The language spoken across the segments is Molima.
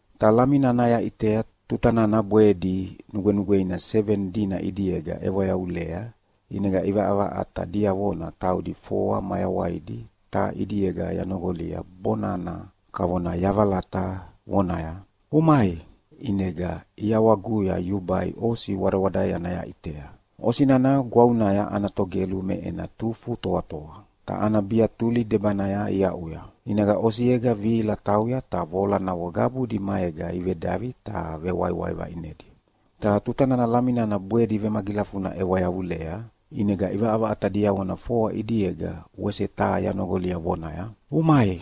Ta Lami nana yaʼitea tuta nana bwedi nugwenugweina seveni dina ʼidiega ʼewa yavulea, ʼinega ʼivaʼavaʼata diavona taudi foa mayawaidi taha ʼidiega yanoqolia bonana kavona yavalata vonaya, “Umai!” ʼInega ʼiawaguya yubai osi wadawadaeana yaʼitea. Osi nana gwavunaya ana togelu me ena tufu toatoa, ta ana biatuli debanaya iaʼuya. ʼInega osiega vihila tauya ta voalanavo qabudi maega ivedavi ta vewaiwai vaʼinedi. Ta tuta nana Lami nana bwedi vemagilafuna ʼewa yavulea, ʼinega ʼivaʼavaʼata diavona foa ʼidiega wese taha yanoqolia vonaya, “Umai!”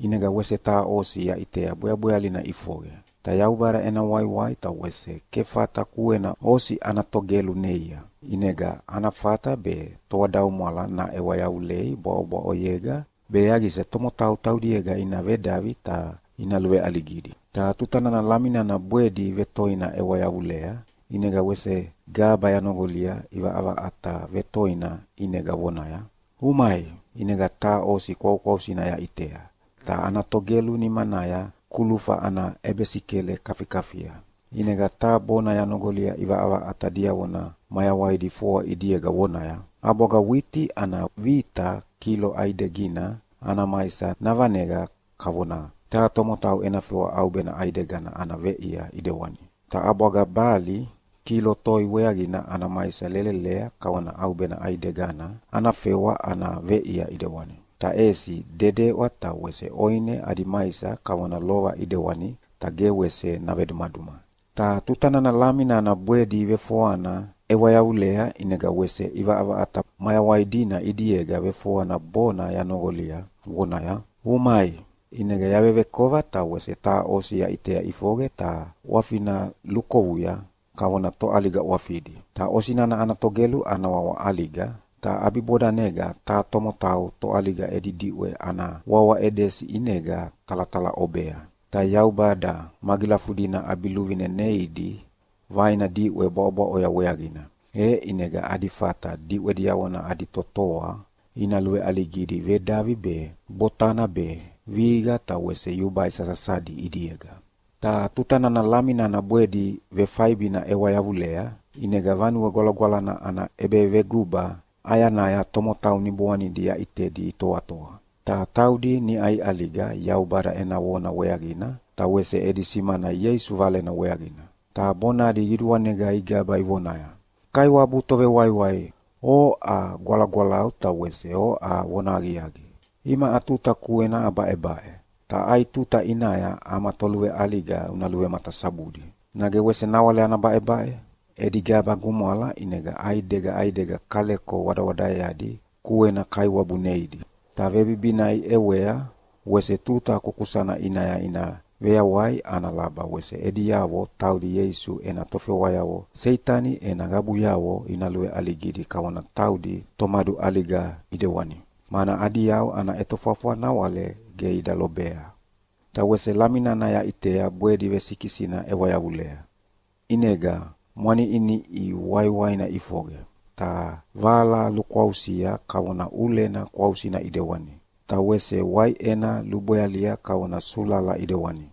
ʼInega wese taha osi yaʼitea bweabwealina ʼifoqe. Ta Yaubada ena waiwai ta wese kefata kuena osi ana togelu neia, ʼinega ana fata be toadaumwala naʼewa yavulei bwaʼobwaʼoyega be yaqisa tomotau taudiega ina vedavi ta ina luveʼaligidi. Ta tuta nana Lami nana bwedi vetoina ʼewa yavulea, ʼinega wese gaba yanoqolia ʼivaʼavaʼata vetoina ʼinega vonaya, “Umai!” ʼInega taha osi kwaukwausina yaʼitea, ta ana togelu nimanaya kulufa ana ʼebesikele kafikafia. ʼInega taha bona yanoqolia ʼivaʼavaʼata diavona mayawaidi foa ʼidiega vonaya, “ʼAbwaga witi ana vita kilo ʼaidegina ana maisa navaneqa kavona taha tomotau ena fewa ʼaubena ʼaidegina ana veʼia ʼidewani. Ta ʼabwaga bali kilo toi weaqina ana maisa lelelea kavona ʼaubena ʼaidegana ana fewa ana veʼia ʼidewani. Ta ʼesi dedeʼwa ta wese ʼoine adi maisa kavona lova ʼidewani ta ge wese navedumaduma!” Ta tuta nana Lami nana bwedi vefoana ʼewa yavulea ʼinega wese ʼivaʼavaʼata mayawai dina ʼidiega vefoana bonana yanoqolia vonaya, “Umai!” ʼInega yavevekova ta wese taha osi yaʼitea ʼifoqe ta ʼwafina lukovuya kavona toʼaliga ʼwafidi. Ta osi nana ana togelu ana wawa ʼAliga, ta ʼabibodanega taha tomotau toʼaliga edi diʼwe ana wawa Edesi ʼinega talatalaʼobea. Ta Yaubada magilafudina ʼabiluvine neidi vaina diʼwe bwaʼobwaʼoya weaqina, e ʼinega adi fata diʼwe diavona adi totoa ina luveʼaligidi vedavi be, botana be, vihiqa ta wese yubai sasasadi ʼidiega. Ta tuta nana Lami nana bwedi vefaibina ʼewa yavulea, ʼinega Vanue Gwalagwalana ana ʼebeveguba ʼayanaya tomotau niboanidi yaʼitedi itoatoa. Ta taudi niʼa iʼaliga Yaubada ena vona weaqina ta wese edi simana Ieisu Valena weaqina. Ta bonadi qiduanega igaba ivonaya, “Kaiwabu Tovewaiwai, oʼa gwalagwalau ta wese oʼa vonahaqiaqi. Imaʼa tuta kuena abaʼebaʼe, ta ai tuta ʼinaya ama toluveʼaliga una luvematasabudi? Nage wese nawale ana baʼebaʼe?” Edi gaba gumwala, ʼinega ʼaidega ʼaidega kaleko wadawadaeadi kuekuena Kaiwabu neidi, ta vebibina iʼewea wese tuta kukusana ʼinaya ina veyawai ana laba wese ediavo taudi Ieisu ena tofewayavo Seitani ena qabuyavo ina luveʼaligidi kavona taudi tomaduʼaliga ʼidewani. Mana adi yau ana ʼetofwafwa nawale ge ida lobea. Ta wese Lami nana yaʼitea bwedi vesikisina ʼewa yavulea. ʼInega mwaniʼiniʼi waiwaina ʼifoqe, ta vala lukwausia kavona ʼulena kwausina ʼidewani, ta wese waiʼena lubwealia kavona sulala ʼidewani.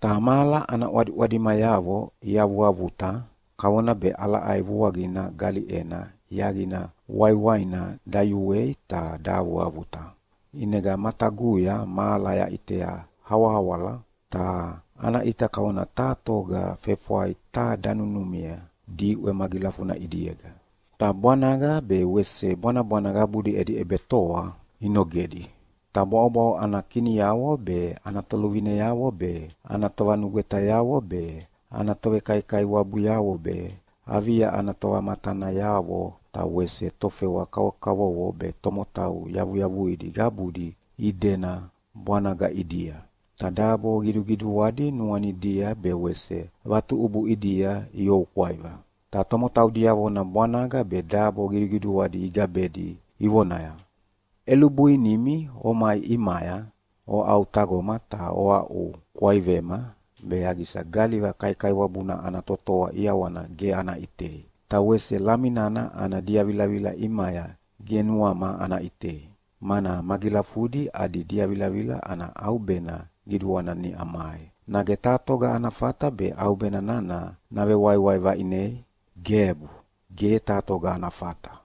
Ta mahala ana ʼwadiʼwadimayavo iavuavuta kavona be ʼalaʼai vuaqina galiʼena yaqina waiwaina dayuei ta dahavuavuta. ʼInega mataguya mahala yaʼitea awahawala, ta ana ʼita kavona taha toga fefwai taha danunumia diʼwe magilafuna ʼidiega, ta bwanaga be wese bwanabwana qabudi edi ʼebetoa inogedi. Ta bwaʼobwaʼo ana kiniavo be, ana toluvineavo be, ana tovanugwetayavo be, ana tovekaikaiwabuyavo be, avia ana tovamatanayavo ta wese tofewa kavovoyavo be tomotau yavuyavuidi qabudi idena bwanaga ʼidia, ta dabo qiduqiduadi nuanidia be wese vatuʼubu ʼidia ioukwaiva. Ta tomotau diavona bwanaga be dabo qiduqiduadi igabedi, ivonaya, “ʼElubuinimi omai ʼimaya oʼautaqoma ta oaʼukwaivema, be yaqisa galiva kaikaiwabuna ana totoa ʼiawana ge ana ʼitei, ta wese Lami nana ana diavilavila ʼimaya ge nuama ana ʼitei. Mana magilafudi adi diavilavila ana ʼaubena qiduana niʼa mai. Nage taha toga ana fata be ʼaubena nana navewaiwai vaʼinei? Gebu, ge taha toga ana fata!”